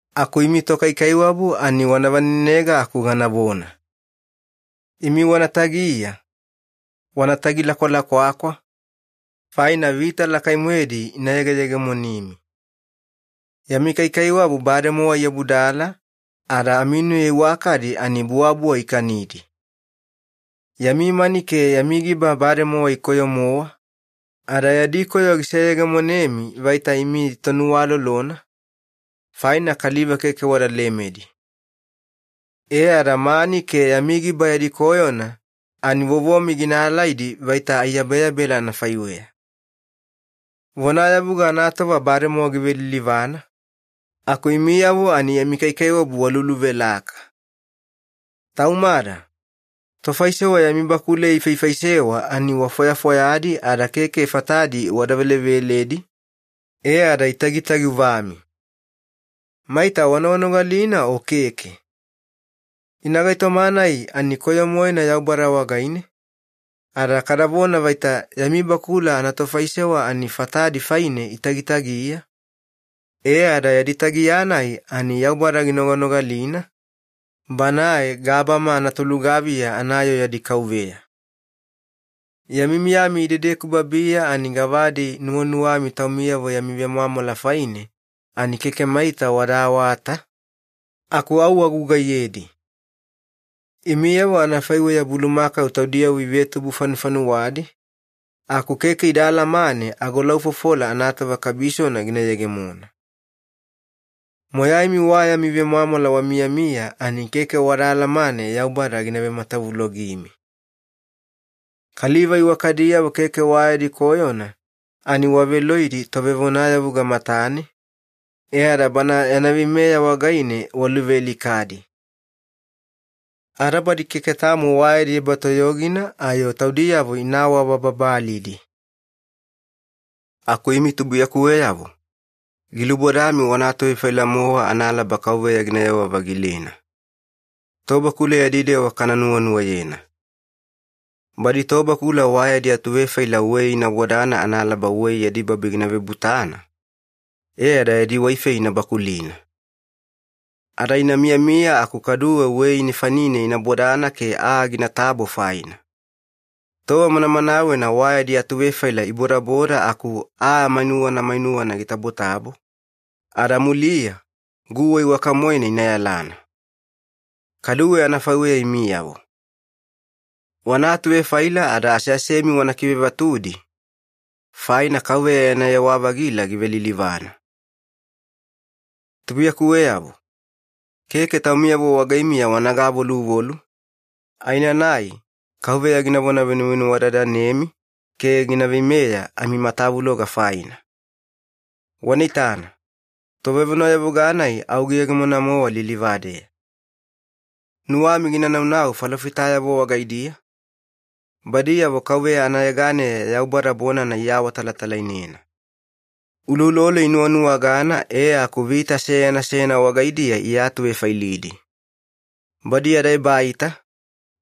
Aku imi tokaikaiwabu ani wana vanenega aku ganavona. Imi wana tagiya, wana tagilakwalakwakwa, faina vita lakai-moedi ina yegeyegemonimi. Yami kaikaiwabu bademowa iabudala, ada aminuya iwakadi ani buwabuwa ikanidi. Yami mani ke yami giba bademowa ikoyo-mowa, ada yadi koyo giseyegemonemi vaita imi tonuwalolona, faina kaliva keke wada lemedi. E ada mani ke yami giba yadi koyona ani vovomi gina alaidi vaita aiyabeyabela anafaiweya. Vonayavuga anatova bademowa givelilivana, aku imiyavo ani yami kaikaiwabu waluluvelaka. Taumada, tofaisewa yami bakuleya ifaifaisewa ani wafwafwayadi ada keke fatadi wada veleveledi, e ada itagitagiuvami. Maita wanoganogalina o keke? Ina gaitoma-nai ani koyo-moena Yaubada wagaine, ada kadavona vaita yami bakula anatofaisewa ani fatadi faine itagitagiya, e ada yadi tagiya-nai ani Yaubada ginoganogalina, Banae gabama anatolugaviya anayoo yadi KAUVEYA. Yami miyami idedeku babiya ani gavadi nuwanuwami taumiyavo yami vemwamwala faine ani keke maita wada awata, aku au wagugaiyedi. Imiyavo anafaiweya bulumakau taudiyavo ivetubu-fanufanuwadi, aku keke ida alamane agolaufofola anatova kabisona gina yegemona. Moyaimi wa yami vemwamwala wamiyamiya, ani keke wada alamane Yaubada gina vematavulogimi. Kaliva iwakadiyavo keke wa yadi koyona ani waveloidi tovevonayavuga matane, e ada bana yana veimeya wagaine waluvealikadi. Ada badi keke tamo wa yadi ebatoyogina ayo taudiyavo ina awabababalidi. Aku imi tubuiyakuweyavo, gilubodami wana atuvefaila-mowa analaba Kauveya ginayewa-vagilena. Tobakula yadi dewa kana nuwanuwayena. Badi tobakula wa yadi atuvefaila wei ina bodana analaba wei yadi babi gina vebutana, e ada yadi waifei ina bakulina. Ada ina miyamiya aku kaduwe wei nefanine ina bodana ke aa ginatabo faina. Tova manamanawena wa yadi atuvefaila ibodaboda aku aa mainuwana mainuwana gitabotabo, ada muliya guwa iwaka-moena ina yalana. Kaduwe anafaiweya imiyavo. Wana atuvefaila ada aseasemi wana kivevatudi, faina KAUVEYA yana yewa-vagila givelilivana. Tubuiyakuweyavo, keke taumiyavo wagaimiya wana gavoluvolu, aenanai Kauveya ginavona venuvenuwadadanemi ke gina veimeya amimatavuloga faina. Wana itana, Tovevonayavuga-nai au giyegemona-mowa lilivadeya. Nuwami gina naunau falofitayavo wagaidiya, badiyavo KAUVEYA anayeganeya Yaubada bonana iawatalatalainena. Uloulolo inuwanuwagana e aku vita seyana seyana wagaidiya iatuvefailidi. Badi yada ebaita,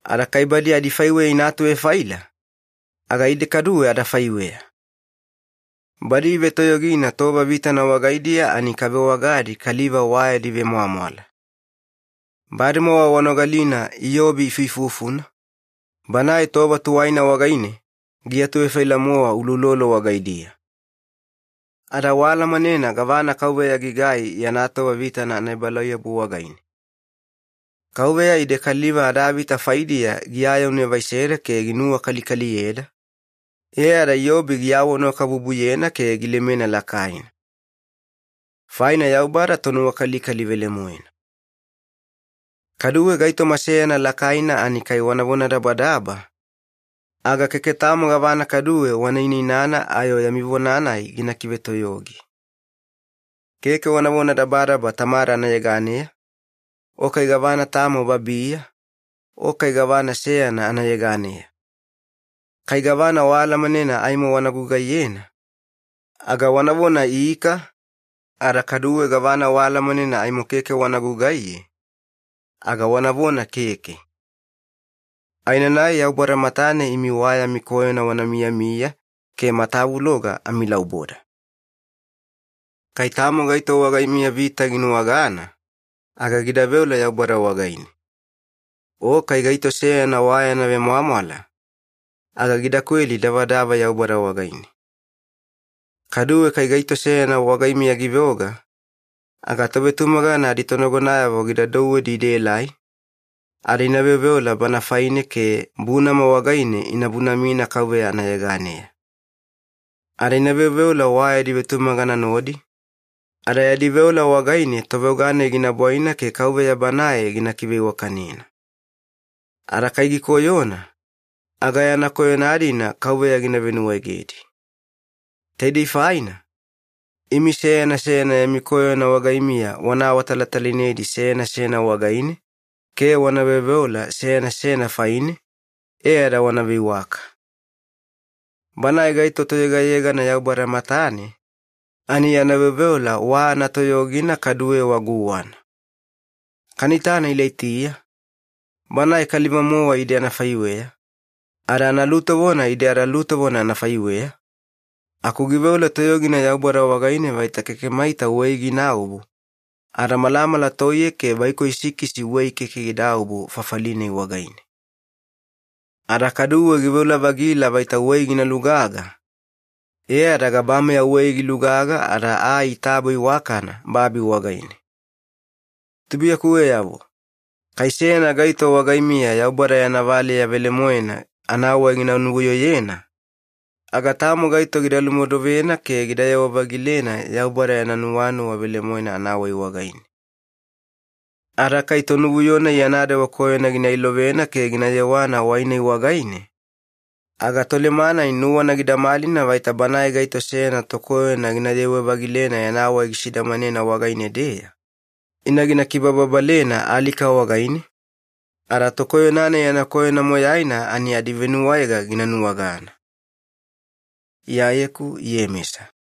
ada kai badi adifaiweya ina atuvefaila, aga ide kaduwe adafaiweya. Badi ivetoyogina tova vitana wagaidiya ani kavewagadi kaliva wa yadi vemwamwala. Bademowa wanogalina Iyobi ifuifufuna, banae tova tuwaina wagaine giatuvefaila-mowa uloulolo wagaidiya. Ada waalamanena gavana KAUVEYA gigai yana tova vitana anaebalauyabu wagaine. KAUVEYA ide kaliva adavita faidiya giayaunevaiseda ke ginuwakalikaliyeda, e ada Iyobi giawanuwakabubuyena ke gilemena lakaina. Faina Yaubada Tonuwakalikali velemoena. Kaduwe gaitoma seyana lakaina ani kai wana vonadabadaba, aga keke tamo gavana kaduwe wana inainana ayo yami vona-nai gina kivetoyogi. Keke wana vonadabadaba Tamada anayeganeya, o kai gavana tamo babiya, o kai gavana seyana anayeganeya. Kai gavana waalamanena aimo wana gugaiye, aga wanavona “ika”, ada kaduwe gavana waalamanena aimo keke wana gugaiye, aga wanavona “keke”. Aenanai Yaubada matane imi wa yami koyona wana miyamiya ke matavuloga amilauboda. Kai tamo gaito wagaimiya vita ginuwagana, aga gida veola Yaubada wagaine. O kai gaito seyana wa yana vemwamwala, aga gida kweli davadava Yaubada wagaine. Kaduwe kai gaito seyana wagaimiya giveoga, aga tovetumagana aditonagonayavo gida douwedi idaelai, ada ina veoveola bana faine ke bunama wagaine ina bunamina Kauveya anayeganeya. Ada ina veoveola wa yadi vetumagana nodi, ada yadi veola wagaine toveoga-nai gina bwaina ke Kauveya Banae gina kiveiwakanena. Ada kai gikoyona, aga yana koyona-dina Kauveya gina venuwaegedi. Taidei faina, imi seyana seyana yami koyona wagaimiya wana awatalatalainedi seyana seyana wagaine ke wana veoveola seyana seyana faine, e ada wana veiwaka. Banae gaito toyegayegana Yaubada matane, ani yana veoveola wa anatoyogina kaduwe wa guwana. Kana itana Ilaitiya, banae kaliva-mowa ide anafaiweya, ada analutovona ide adalutovona anafaiweya, aku giveola toyogina Yaubada wagaine vaita keke maita wei ginaobu, ada malamala toiye ke vaikoi sikisi wei keke gidaobu fafali-nai wagaine. Ada kaduwe giveola-vagila vaita wei gina lugaga, e ada gabameya wei gilugaga ada aa itabo iwakana babi wagaine. Tubuiyakuweyavo, kai seyana gaito wagaimiya Yaubada yana valeya velemoena anawai gina nuvuyoyena, aga tamo gaito gida lumodovena ke gidayewa-vagilena Yaubada yana nuwanuwa velemoena anawai wagaine. Ada kai tonuvuyo-nai yana dewa koyona gina ilovena ke gina yewana wai-nai wagaine, aga toleme-nai nuwana gida malina vaita banae gaito seyana tokoyona gina yewe-vagilena yana wai gisidamanena wagaine-deya, ina gina kibababalena alika wagaine, ada tokoyona-nai yana koyona moyaina ani adivenuwaega gina nuwagana. Iyayeku Iyemesa